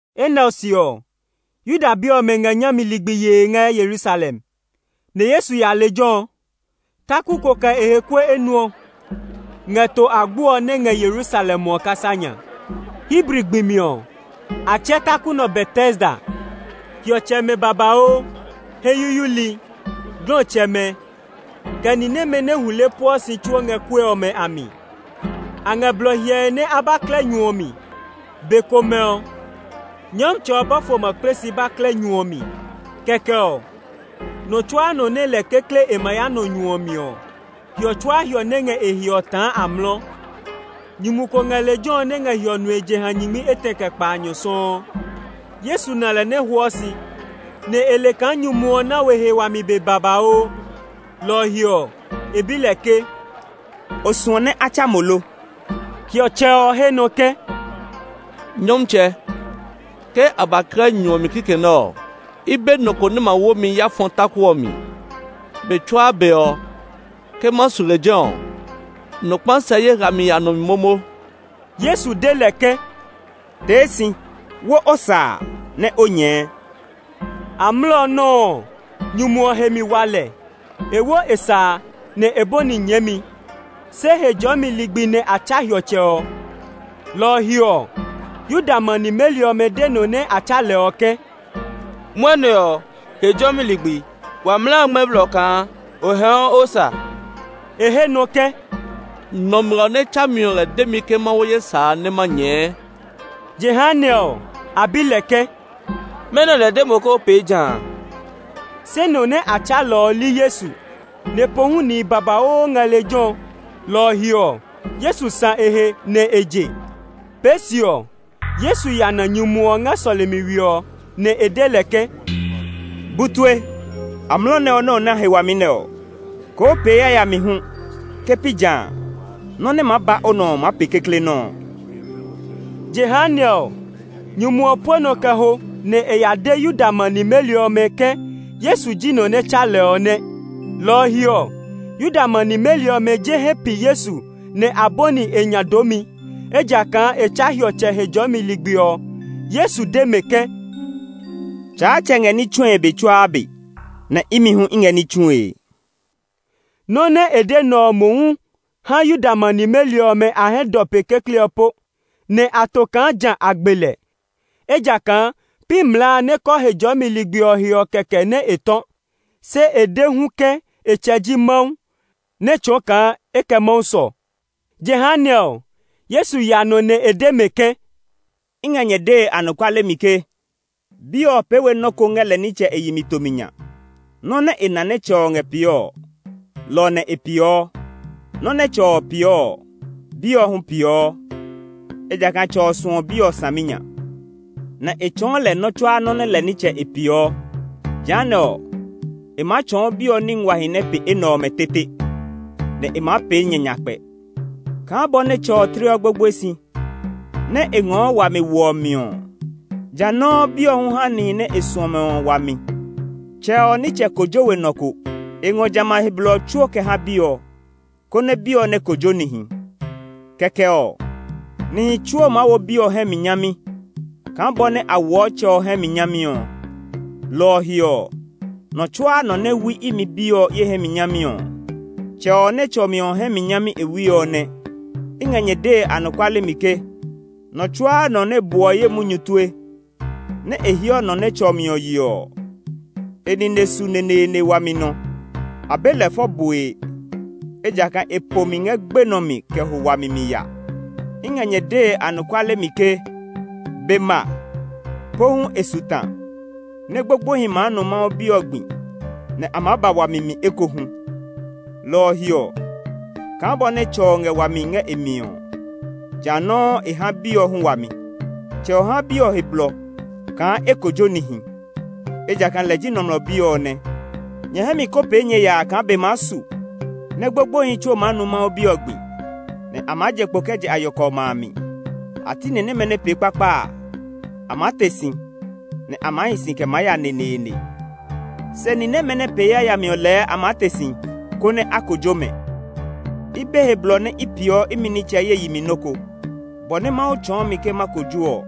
Enɛ ɔ se ɔ, Yuda bi ɔmɛ ngɛ nyami ligbi yee ngɛ Yerusalem, nɛ Yesu ya lejɛ ɔ. Taku ko kɛ e he kue enuɔ ngɛ To Agbo ɔ nɛ ngɛ Yerusalem ɔ kasa nya. Hebri gbi mi ɔ, a tsɛɛ taku nɛ ɔ Betesda. Hiɔtsɛmɛ babauu, hɛ yuyuili, glɔtsɛmɛ, kɛ ni nɛmɛ nɛ hule pueɔ si tsuo ngɛ kue ɔmɛ a mi. [A ngɛ blɔ hyɛe nɛ a ba klɛ nyu ɔ mi. Be komɛ ɔ, Nyɔmtsɛ ɔ bɔfo ma kple si ba klɛ nyu ɔ mi; kɛkɛ ɔ, nɔ tsuaa nɔ nɛ lɛ kekle e ma ya nɔ nyu ɔ mi ɔ, hiɔ tsuaa hiɔ nɛ ngɛ e he ɔ taa amlɔ.] Nyumu ko ngɛ lejɛ ɔ nɛ ngɛ hiɔ nue jeha nyingmi etɛ kɛ kpaanyɔ sɔuu. Yesu na lɛ nɛ hwɔɔ si, nɛ e le kaa nyumu ɔ na we he wami be babauu. Lɔ ɔ he ɔ, e bi lɛ ke, “O suɔ nɛ a tsa mo lo?” Hiɔtsɛ ɔ he nɔ ke, “Nyɔmtsɛ, ke a ba klɛ nyu ɔ mi kikɛ nɛ ɔ, i be nɔ ko nɛ ma wo mi ya fɔ taku ɔ mi. Be tsuaa be ɔ, ke ma su lejɛ ɔ, nɔ kpa sɛ ye hlami ya nɔ mi momo.” Yesu de lɛ ke, “Tee si, wo o sa a nɛ o nyɛɛ.” Amlɔ nɔuu ɔ, nyumu ɔ he mi wa lɛ; e wo e sa a, nɛ e bɔni nyɛɛmi. Se Hejɔɔmi ligbi nɛ a tsa hiɔtsɛ ɔ. Lɔ ɔ he ɔ, Yuda ma nimeli ɔmɛ de nɔ nɛ a tsa lɛ ɔ ke, “Mwɔnɛ ɔ, Hejɔɔmi ligbi; wa mlaa a ngmɛ́ blɔ kaa o hɛɛɔ o sa.” E he nɔ ke, “Nɔmlɔ nɛ tsa mi ɔ lɛ de mi ke ma wo ye sa a nɛ ma nyɛɛ.” Jehanɛ ɔ, a bi lɛ ke, “Mɛnɔ lɛ de mo ke o pee jã a?” Se nɔ nɛ a tsa lɛ ɔ li Yesu; nɛ pohu nihi babauu ngɛ lejɛ ɔ, lɔ ɔ he ɔ, Yesu sã e he nɛ e je. Pee se ɔ, Yesu ya na nyumu ɔ ngɛ sɔlemi we ɔ, nɛ e de lɛ ke, “Bu tue, amlɔ nɛ ɔ nɛ o na he wami nɛ ɔ, koo pee yayami hu. Ke pi jã a, nɔ́ nɛ maa ba o nɔ ɔ maa pe kekle nɔ́ ɔ.” Jehanɛ ɔ, nyumu ɔ pue nɔ kɛ ho nɛ e ya de Yuda ma nimeli ɔmɛ ke Yesu ji nɔ nɛ tsa lɛ ɔ nɛ. Lɔ ɔ he ɔ, Yuda ma nimeli ɔmɛ je hɛ pi Yesu nɛ a bɔni e nya doomi, ejakaa e tsa hiɔtsɛ Hejɔɔmi ligbi ɔ. Yesu de mɛ ke, “Tsaatsɛ ngɛ ní tsue be tsuaa be, nɛ imi hu i ngɛ ní tsue.” Nɔ nɛ e de nɛ ɔ mohu ha Yuda ma nimeli ɔmɛ a hɛ dɔ pe kekle ɔ po, nɛ a to kaa ja a gbe lɛ. Ejakaa pi mlaa a nɛ kɔɔ Hejɔɔmi ligbi ɔ he ɔ kɛkɛ nɛ e tɔ̃; se e de hu ke e tsɛ ji Mawu, nɛ́ tsɔɔ kaa e kɛ Mawu sɔ. Jehanɛ ɔ, Yesu ya nɔ nɛ e de mɛ ke, “I ngɛ nyɛ dee anɔkuale mi ke Bi ɔ pee we nɔ́ ko ngɛ lɛ nitsɛ e yi mi tomi nya. Nɔ́ nɛ e na nɛ Tsɛ ɔ ngɛ pee ɔ, lɔ ɔ nɛ e peeɔ. Nɔ́ nɛ Tsɛ ɔ peeɔ ɔ, Bi ɔ hu peeɔ. Ejakaa Tsɛ ɔ suɔ Bi ɔ saminya, nɛ e tsɔɔ lɛ nɔ́ tsuaa nɔ́ nɛ lɛ nitsɛ e peeɔ. Jehanɛ ɔ, e maa tsɔɔ Bi ɔ ní nguahi nɛ pe enɛ ɔmɛ tete, nɛ e maa pee nyɛ nyakpɛ. Kaa bɔ nɛ Tsɛ ɔ tleɔ gbogboe si, nɛ e ngɔɔ wami woɔ mi ɔ, jã nɔuu Bi ɔ hu haa níhi nɛ e suɔ mɛ ɔ wami. Tsɛ ɔ nitsɛ kojo we nɔ ko. E ngɔ jamɛ a he blɔ ɔ tsuo kɛ ha Bi ɔ, konɛ Bi ɔ nɛ kojo nihi. Kɛkɛ ɔ, nihi tsuo maa wo Bi ɔ hɛ mi nyami kaa bɔ nɛ a woɔ Tsɛ ɔ hɛ mi nyami ɔ. Lɔ ɔ he ɔ, nɔ tsuaa nɔ nɛ wui imi Bi ɔ, ye hɛ mi nyami ɔ, Tsɛ ɔ nɛ tsɔ mi ɔ hɛ mi nyami e wui ɔ nɛ. “I ngɛ nyɛ dee anɔkuale mi ke, nɔ tsuaa nɔ nɛ buɔ ye munyu tue, nɛ e heɔ nɔ nɛ tsɔ mi ɔ yeɔ ɔ, e nine su neneene wami nɔ. A be lɛ fɔ bue, ejakaa e po mi ngɛ gbenɔ mi kɛ ho wami mi ya. I ngɛ nyɛ dee anɔkuale mi ke be ma, pohu e su ta, nɛ gbogboehi maa nu Mawu Bi ɔ gbi, nɛ a maa ba wami mi ekohu. Lɔ ɔ he ɔ, kaa bɔ nɛ Tsɛ ɔ ngɛ wami ngɛ e mi ɔ, ja nɔuu e ha e Bi ɔ hu wami. Tsɛ ɔ ha Bi ɔ he blɔ kaa e kojo nihi, ejakaa lɛ ji Nɔmlɔ Bi ɔ nɛ. Nyɛ hɛ mi kó pee nyɛ yaa kaa be maa su nɛ gbogboehi tsuo maa nu Mawu Bi ɔ gbi, nɛ a maa je kpo kɛ je a yɔkɔ ɔmɛ a mi. A ti ni nɛmɛ nɛ pee kpakpa a, a maa te si, nɛ a maa hi si kɛ maa ya neneene; se ni nɛmɛ nɛ pee yayami ɔ lɛɛ a maa te si, konɛ a kojo mɛ. “I be he blɔ nɛ i peeɔ imi nitsɛ ye yi mi nɔ́ ko. Bɔ nɛ Mawu tsɔɔ mi ke ma kojo ɔ,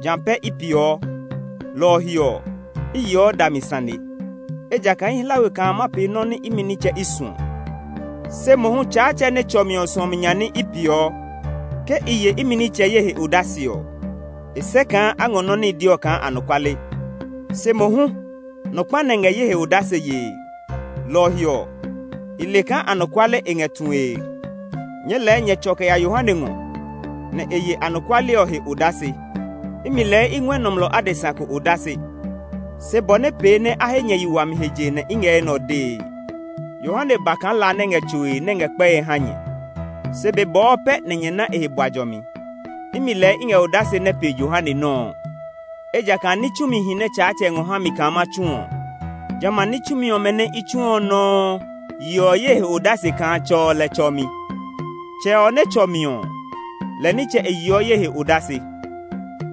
jã pɛ i peeɔ; lɔ ɔ he ɔ, i yeɔ dami sane. Ejakaa i hla we kaa ma pee nɔ́ nɛ imi nitsɛ i suɔ, se mohu Tsaatsɛ nɛ tsɔ mi ɔ suɔmi nya ní i peeɔ. “Ke i ye imi nitsɛ ye he odase ɔ, e sɛ kaa a ngɔ nɔ́ nɛ i de ɔ kaa anɔkuale. Se mohu nɔ kpa nɛ ngɛ ye he odase yee; lɔ ɔ he ɔ, i le kaa anɔkuale e ngɛ tue. Nyɛɛ lɛɛ nyɛ tsɔ kɛ ya Yohane ngɔ, nɛ e ye anɔkuale ɔ he odase. Imi lɛɛ i ngɔɛ nɔmlɔ adesa ko odase, se bɔ nɛ pee nɛ a he nyɛ yi wami he je nɛ i ngɛ enɛ ɔ dee. Yohane ba kaa la nɛ ngɛ tsoe, nɛ ngɛ kpɛe ha nyɛ. Se be bɔɔ pɛ nɛ nyɛ ná e he bua jɔmi. Imi lɛɛ i ngɛ odase nɛ pe Yohane nɔ́ ɔ, ejakaa ní tsumihi nɛ Tsaatsɛ ngɔ ha mi kaa ma tsu ɔ, jamɛ a ní tsumi ɔmɛ nɛ́ i tsuɔ ɔ nɔuu yeɔ ye he odase kaa Tsɛ ɔ lɛ tsɔ mi. Tsɛ ɔ nɛ tsɔ mi ɔ, lɛ nitsɛ e yeɔ ye he odase,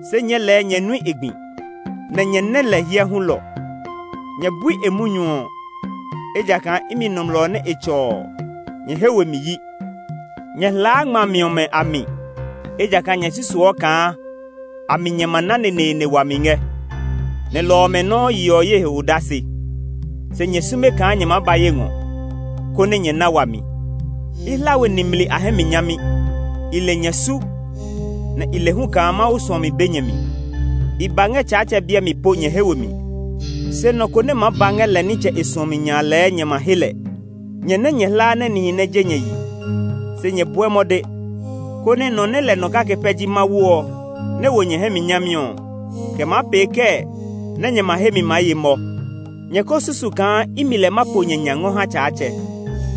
se nyɛɛ lɛɛ nyɛ nui e gbi, nɛ nyɛ nɛ lɛ hyɛ hulɔ. Nyɛ bui e munyu ɔ, ejakaa imi nɔmlɔ nɛ e tsɔ ɔ, nyɛ he we mi yi. Nyɛ hlaa ngmami ɔmɛ a mi, ejakaa nyɛ susuɔ kaa a mi nyɛ ma na neneene wami ngɛ; nɛ lɔ ɔmɛ nɔuu yeɔ ye he odase. Se nyɛ sume kaa nyɛ maa ba ye ngɔ, konɛ nyɛ na wami. “I hla we nimli a hɛ mi nyami. I le nyɛ su, nɛ i le hu kaa Mawu suɔmi be nyɛ mi. I ba ngɛ Tsaatsɛ biɛ mi po nyɛ he we mi; se nɔ ko nɛ maa ba ngɛ lɛ nitsɛ e suɔmi nya a lɛɛ nyɛ ma he lɛ. Nyɛ nɛ nyɛ hlaa nɛ nihi nɛ je nyɛ yi, se nyɛ bɔɛ mɔde, konɛ nɔ nɛ lɛ nɔ kake pɛ ji Mawu ɔ nɛ wo nyɛ hɛ mi nyami ɔ, kɛ maa pee kɛɛ nɛ nyɛ ma he mi maa ye mɔ? Nyɛ ko susu kaa imi lɛ ma po nyɛ nya ngɔ ha Tsaatsɛ.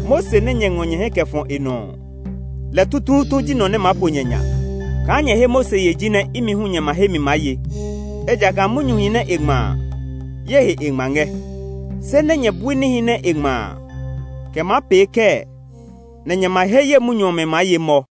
Mose nɛ nyɛ ngɔ nyɛ hɛ kɛ fɔ e nɔ ɔ, lɛ tutuutu ji nɔ nɛ maa po nyɛ nya. Kaa nyɛ he Mose ye jinɛ imi hu nyɛ ma he mi maa ye, ejakaa munyuhi nɛ e ngma a, ye he e ngma ngɛ. Se nɛ nyɛ bui níhi nɛ e ngma a, kɛ maa pee kɛɛ nɛ nyɛ ma he ye munyu ɔmɛ maa ye mɔ?”